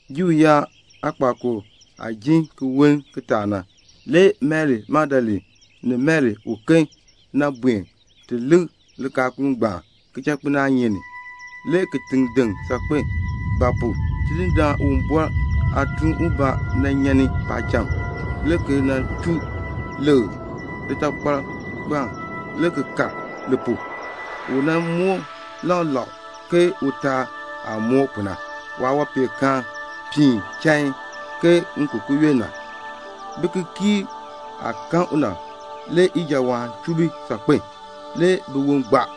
Juu yaab aakpakool daal aah jin ki woln kitaak na, le Mari Magdalene ni Mari uken buen ti lik likaakul ngbaan kichakpinaanyeek ni. Le kitiŋ deŋ saakpen; ba pu? Tidindaan Uwumbɔr aatuun ubaa nyan ni paacham, le ki nan chuu lekr litakpal ngbaan, le ki kal li pu. U moor lak lak ke utaal aah moor pu na. Waawanpeenkaan piin chain ke ŋikukuyon na. Bikikiirb aah kan u na, le ijawaan chuu bi saakpen a. Le biwon gbaa.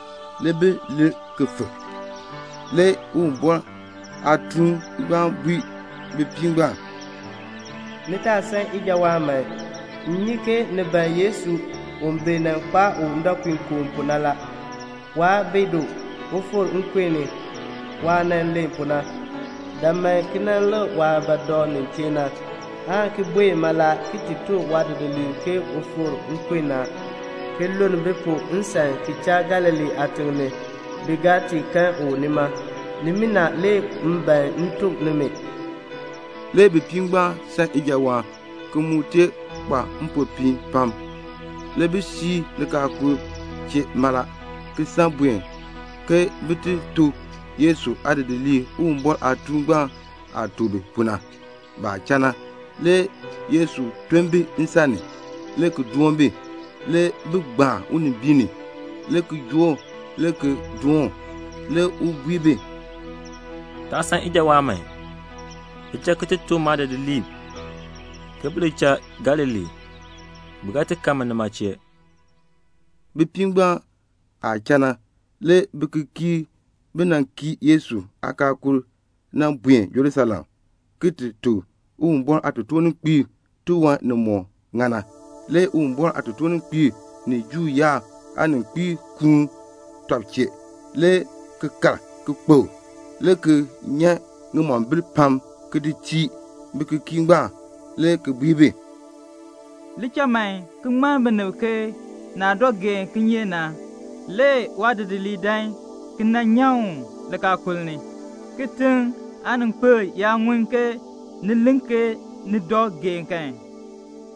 Le bi lir fik. Le Uwumbɔr aatuun ngbaan bui bipiib ngbaan, "Ni taa san ijawaan man. M nyi ke ni ban Yesu u bi nan kpaa u ndɔpuinkoo pu na. Waa bi du. U fikr nkun ni waah nan len pu na. Dan man ki nan lik waah ba dɔ nin chee na, aan ki buen mala ki ti tuk waadidiliib ke u fikr nkun ni a, ki luln bi pu nsan ki cha Galilee aatiŋ ni la. Bi ga ti kan u nima. Nimina le m ban m tuk nimi." Le bipiib ngbaan san ijawaan, ki mu kpa mpopiin pam. Le bi fii likaakul chee mala, ki san buen ke bin ti tuk Yesu aadidiliib Uwumbɔr aatuun aah tuk bi pu na. Baah cha na, le Yesu ton bi nsan ni, le ki doon bi. Le bi gbaan unimbiin ni, le ki joo u le ki doon u. Le u bui bi, "Taa san ijawaan man. Li cha ki ti tuk maadidiliib ke bi li cha Galilee. Bi ga kan mi nima chee." Bipiib ngbaan aah cha na, le bikikiirb bi kii Yesu aakaakul na buen Jerusalem, ki ti tuk Uwumbɔr aatotoorninkpiib tiwan nimɔk ŋa na. Le Uwumbɔr aatotoorninkpiib ni Juu yaab aaninkpiib kuun tɔb chee, le ki kal kpokl, le ki nyan ŋimombil pam, ki di tii bikikiirb ngbaan, le ki bui bi, "Li cha man ki ŋmann binib ke naah dɔ geen kinyeek na, waadidiliib dan ki nan nyan u likaakul ni a. Kitiŋ aaninkpil yaa ŋun ke ni len ke ni dɔ geen kan,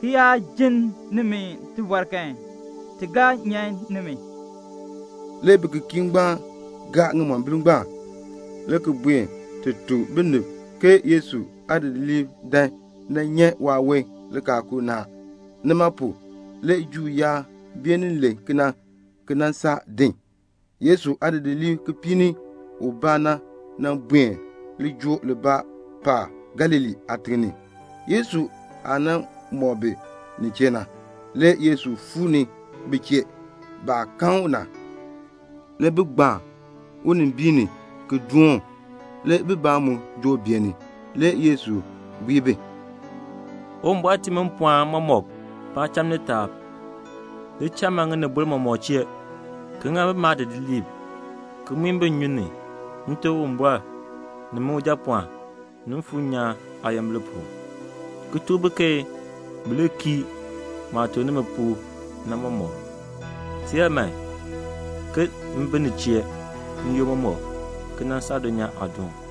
ki yaa ji nimi tibɔr kan, ti ga nyan nimi." Le bikikiirb ngbaan gaa ŋimombil ngbaan, le ki buen ti tuk binib ke Yesu aadidiliib dan nan nyan waawon likaakul ni a. Nima pu na le Juu yaab beenin len kena le ki nan saa din. Le Yesu aadidiliib kipiik ni ubaa buen lijool libaa paab Galilee aatiŋ ni, Yesu aah nan mɔk bi nin chee na. Le Yesu fuu ni bi chee. Baah kan u na, le bi gbaan unimbiin ni ki doon u. Le bibaa mu joo beeni. Le Yesu bui bi, "Uwumbɔr tii mi mpɔɔn mɔmɔk paacham ni taab. Li cha man ŋinibol mɔmɔk chee, ki ŋa bi maadidiliib, ki muin bi nnyun ni, Nte Uwumbɔr, ni min Ujapɔɔn, ni Mfuur nyaan aayimbil pu, ki tuk bi ke bi li kii maah tuk nimi pu na mɔmɔk. Teer man, m bi ni chee n-yoonn mɔmɔk, ki nan saa dulnyaa aadoon."